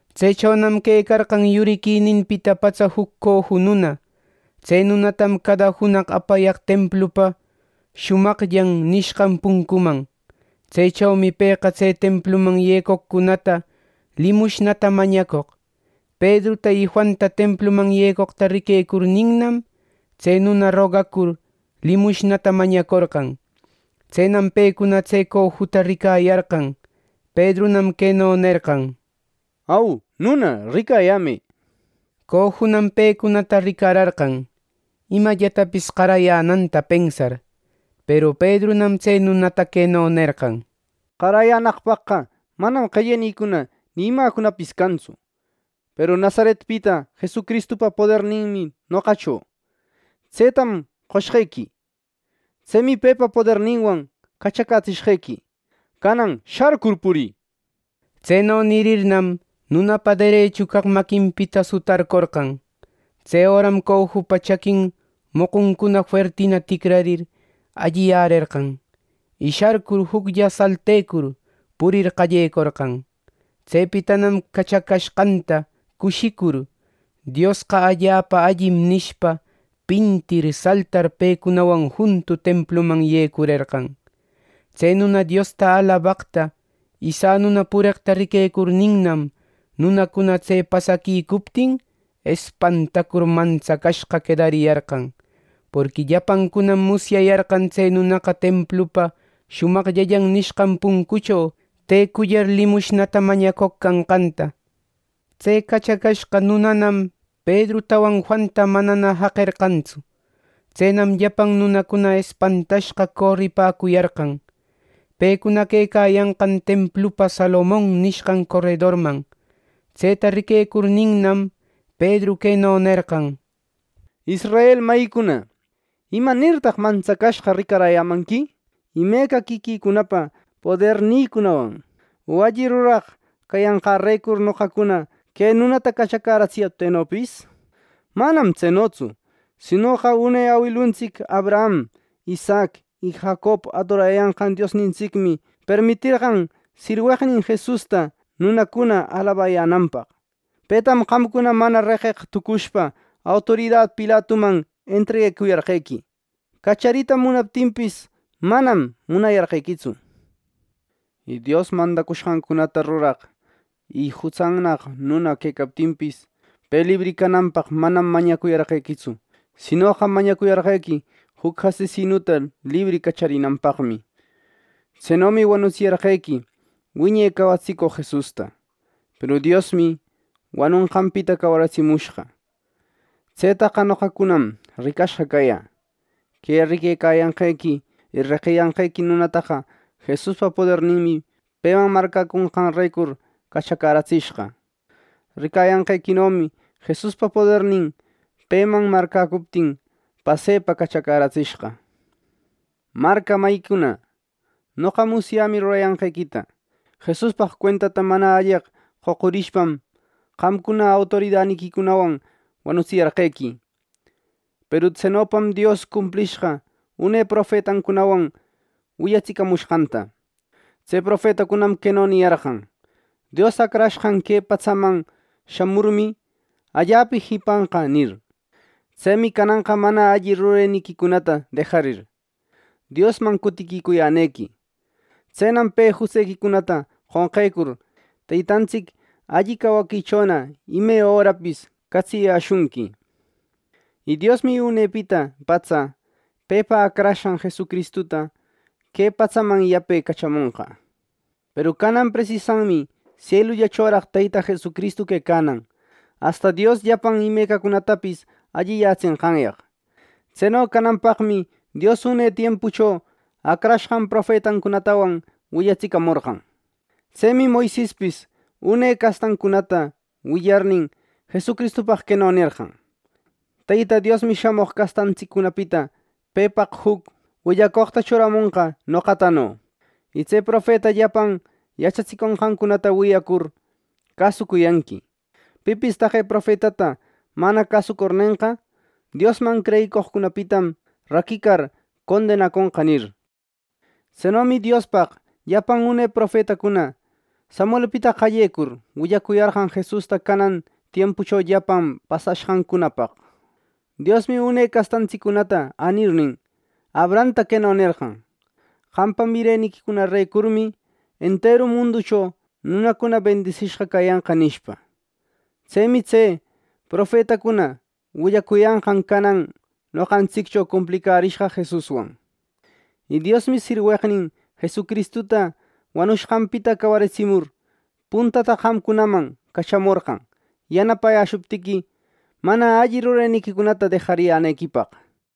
Tsechonam quecarqan yuriquininpita patsa juc coju nuna. Tse nunatam cada junaq apayaq templupa “Shumaqllan” nishqan puncuman. Tsechomi pëqa tse templuman yecoqcunata limushnata mañacoq. Pedruta y Juanta templuman yecoqta riquecurninnam, tse nuna rogacur limushnata mañacorqan. Tsenam pecuna tse cojuta ricaräyarqan. Pedrunam queno nerqan: —Au, nuna, ricayämë —nishpa. Cojunam pecunata ricararqan, imallatapis qarayänanta pensar. Peru Pedrunam tse nunata queno nerqan: —Qarayänaqpaqqa manam qellenïcuna ni imäcunapis cantsu. Peru Nazaretpita Jesucristupa poderninmi noqacho, tsetam qoshqequi. Tsemi pepa poderninwan cachacätsishqequi. ¡Canan sharcur purï! —nir. Tseno nirirnam, nunapa derechu caq maquinpita sutarcorqan. Tse öram cojupa chaqui moquncuna fuertina ticrarir, alliyärerqan; y sharcur, juclla saltecur, purir qallecorqan. Tsepitanam cachacashqanta cushicur: “¡Diosqa allapa allim!” nishpa, pintir saltar, pecunawan juntu templuman yecurerqan. Tse nuna Diosta alabaqta y sanuna pureqta riquecurninnam, nunacuna tse pasaquicuptin, espantacur mantsacashqa quedariyarqan. Porqui llapancunam musyayarqan tse nunaqa templupa “Shumaqllan” nishqan puncucho tecullar limushnata mañacoq canqanta. Tse cachacashqa nunanam Pedrutawan Juanta manana jaqerqantsu. Tsenam llapan nunacuna espantashqa coripäcuyarqan, pecuna quecayanqan templupa Salomon nishqan coredorman. Tseta riquecurninnam, Pedru queno nerqan: “Israel mayicuna, ¿imanirtaq mantsacashqa ricaräyämanqui, imeca quiquïcunapa podernïcunawan o alli ruraq cayanqärecur noqacuna que nunata cachacäratsiyaptïnopis? ¡Manam tsenotsu! Sinoqa une awiluntsic Abraham, Isaac y Jacob adorayanqan Diosnintsicmi permiterqan sirweqnin Jesusta nunacuna alabayänanpaq. Petam qamcuna mana reqeq tucushpa autorida Pilatuman entreguecuyarqequi. Cacharita munaptinpis, manam munayarqequitsu. Y Dios mandacushqancunata ruraq y jutsannaq nuna quecaptinpis, pe libri cananpaqqa manam mañacuyarqequitsu; sinoqa mañacuyarqequi juc asesinuta libri cacharinanpaqmi. Tsenomi wanutsiyarqequi wiñe cawatsicoq Jesusta. Peru Diosmi wanonqanpita cawaritsimushqa. Tsetaqa noqacunam ricashqa cayä. Que riquecayanqequi y reqiyanqequi nunataqa Jesuspa poderninmi, peman marcäconqanrecur, cachacäratsishqa. Ricayanqequinomi Jesuspa podernin, peman marcäcuptin, pasepa cachacäratsishqa. “Marca mayicuna, noqa musyämi rurayanqequita. Jesuspaq cuentata mana alleq qocurishpam, qamcuna autoridaniquicunawan wanutsiyarqequi. Peru tsenopam Dios cumplishqa une profetancunawan willacatsimonqanta. Tse profetacunam queno niyarqan: ‘Dios Acrashqan que patsaman shamurmi, allapa jipanqa’ nir. Tsemi cananqa mana alli rureniquicunata dejarir, Diosman cutiquicuyänequi. Tsenam pe jutsequicunata qonqecur, Teytantsic alli cawaquichona ime örapis catsiyäshunqui. Y Diosmi unepita patsa Pepa Acrashqan Jesucristuta que patsaman yape cachamonqa. Peru canan presisanmi sielullachoraq Teyta Jesucristu quecanan, asta Dios llapan imecacunatapis alliyätsenqanyaq. Tseno cananpaqmi Dios une tiempucho acrashqan profetancunatawan willacatsimorqan. Tsemi Moisespis une castantsiccunata willarnin, Jesuspaq queno nerqan: ‘Teyta Diosmi shamoq castantsiccunapita pepaq juc willacoqta churamonqa noqatano. Y tse profeta llapan yachatsicushqancunata wiyacur, cäsucuyanqui. Pipis taqe profetata mana cäsucurnenqa, Diosman creyicoqcunapitam raquicar, condenaconqa’, nir. “Tsenomi Diospaq llapan une profetacuna, Samuelpita qallecur, willacuyarqan Jesusta canan tiempucho llapan pasashqancunapaq. Diosmi une castantsiccunata änirnin, Abrahamta queno nerqan: ‘Qampa mireniquicunarecurmi enteru munducho nunacuna bendisishqa cayanqa’ nishpa. Tsemi tse profetacuna willacuyanqan canan noqantsiccho cumplicärishqa Jesuswan. Y Diosmi sirweqnin Jesucristuta wanushqanpita cawaritsimur, puntata qamcunaman cachamorqan yanapayäshuptiqui, mana alli rureniquicunata dejayänequipaq.”